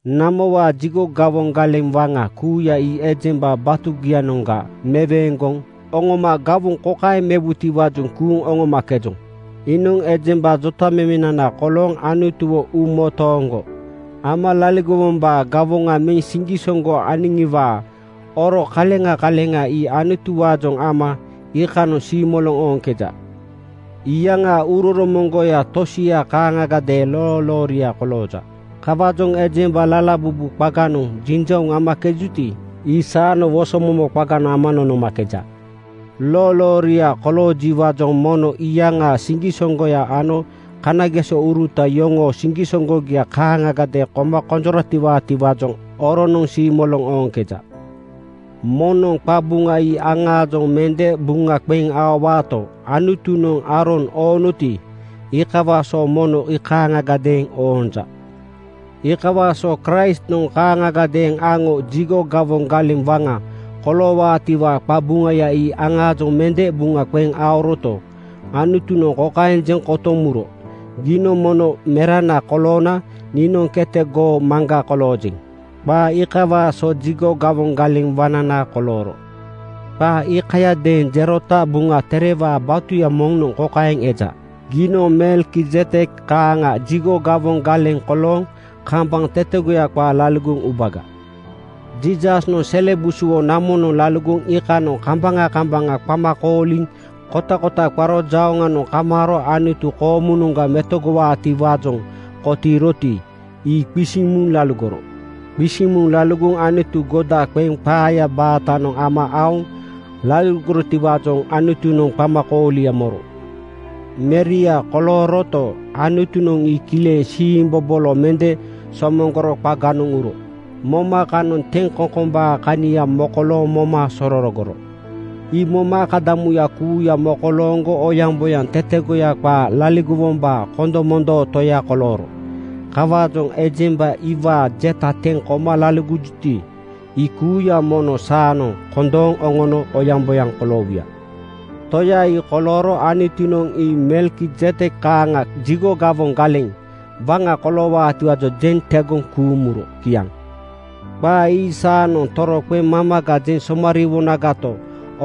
Namowaa jigo gawoŋ galeŋ waŋa kuuya ii ejemba batugianoŋga meweeŋgoŋ oŋoma gawoŋ kokaeŋ mewutiwaajoŋ kuuŋ oŋomakejoŋ: Iinoŋ ejemba jotamemenana kolooŋ Anutuwo uumotooŋgo ama laligowombaa gawoŋa meŋ siŋgisoŋgo aniŋiwaa oro kaleŋa kaleŋa ii Anutuwaajoŋ ama iikanoŋ siimoloŋ ooŋkeja. Iyaŋaa uuroromoŋgoya tosianoŋ kaaŋagadeeŋ loolooria kolooja. Kawaajoŋ ejemba lalabubu qaganoŋ jinjauŋ amakejuti, ii saanoŋ wosomomo qaganoŋ ama nonomakeja. Loolooria koloojiwaajoŋ mono iyaŋaa siŋgisoŋgoya ano kanagesouruta yoŋoo siŋgisoŋgogia kaaŋagadeeŋ koma konjoratiwaatiwaajoŋ oronoŋ siimoloŋ ooŋkeja. Moŋnoŋ qabuŋa ii aŋaajoŋ mende buŋa qeŋ aowaato, Anutunoŋ Aaron oonoti, iikawaa so mono ii kaaŋagadeeŋ oonja. Iikawaa so Kraistnoŋ kaaŋagadeeŋ aŋo jigo gawoŋ galeŋ waŋa koloowaatiwaa qabuŋaya ii aŋaajoŋ mende buŋa qeŋ aoroto, Anutunoŋ kokaeŋ jeŋ kotoŋ muro, “Giinoŋ noo Merana koloona niinoŋ kete goo Maŋga koloojeŋ.” Qaa iikawaa so jigo gawoŋ galeŋ waŋnana kolooro. Qaa iikayadeeŋ jerota Buŋa Terewaa batuya moŋnoŋ kokaeŋ eja, “Giinoŋ Melkizedek kaaŋa jigo gawoŋ galeŋ kolooŋ kambaŋ tetegoya qaa laligoŋ ubaga.” Jiisasnoŋ sele busuwo namonoŋ laligoŋ iikanoŋ kambaŋa kambaŋa qama kooliŋ kotakota qaro jauŋanoŋ kamaaro Anutu koomunoŋga metogowaatiwaajoŋ kotiiroti, ii qisiŋ muŋ laligoro. Qisiŋ muŋ laligoŋ Anutu goda qeŋ qaayaa baatanoŋ ama aoŋ laligorotiwaajoŋ Anutunoŋ qamakoolia moro. Meria kolooroto, Anutunoŋ ii kileŋ siimbobolo mende somoŋgoro qaganoŋ uro moma kanoŋ teŋkoŋkombaa kania mokolooŋ moma sororogoro. Ii moma akadamuya kuuya mokolooŋgo oyaŋboyaŋ tetegoya qaa laligowombaa kondomondoo Toya kolooro. Kawaajoŋ ejemba iwaa jeta teŋ koma laligojuti, ii kuuya mono saanoŋ kondooŋ oŋono oyaŋboyaŋ koloowuya. Toya ii kolooro Anutunoŋ ii Melkizedek kaaŋa jigo gawoŋ galeŋ waŋa koloowaatiwaajoŋ jeŋ tegoŋ kuuŋ muro. Kiaŋ. Qaa ii saanoŋ toroqeŋ mamaga jeŋ somariiwonagato,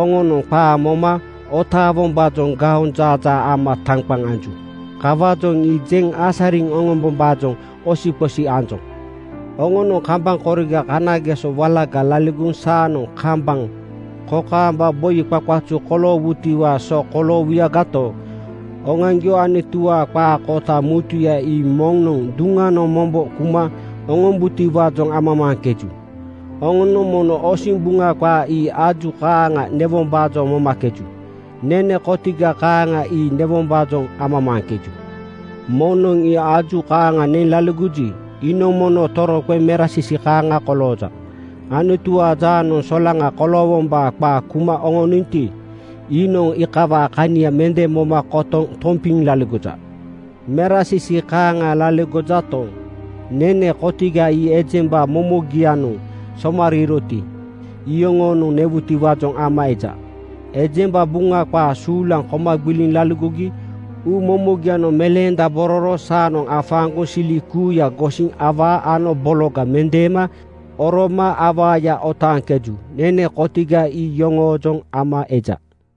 oŋonoŋ qaa moma otaawombaajoŋ gaonjaajaa ama taŋqaŋ anju. Kawaajoŋ ii jeŋ asariŋ oŋombombaajoŋ osiqosi anjoŋ. Oŋonoŋ kambaŋ koriga kanageso walaga laligoŋ saanoŋ kambaŋ kokaamba boi qaqazu koloowutiwaa so koloowuyagato, oŋoaŋgio Anutuwaa qaa kota mutuya ii moŋnoŋ duŋanoŋ mombo kuma oŋombaatiwaajoŋ amamaaŋkeju. Oŋonoŋ mono osiŋ Buŋa qaa ii aju kaaŋa newombaajoŋ momakeju. Nene kotiga kaaŋa ii newombaajoŋ amamaaŋkeju. Moŋnoŋ ii aju kaaŋa neŋ laligoji, iinoŋ mono toroqeŋ merasisi kaaŋa kolooja. Anutuwaa jaanoŋ solaŋa koloowombaa qaa kuma oŋoninto, iinoŋ iikawaa kania mende moma kotoŋ tompiŋ laligoja. Merasisi kaaŋa laligojato, nene kotiga ii ejemba momogianoŋ somariiroti, iyoŋonoŋ newutiwaajoŋ ama eja. Ejemba Buŋa qaa suulaŋ koma gbiliŋ laligogi uumomogianoŋ meleendabororo saanoŋ afaaŋgoŋ sili kuuya gosiŋ awaa ano bologa mendeema oroma awaaya otaaŋkeju. Nene kotiga ii iyoŋoojoŋ ama eja.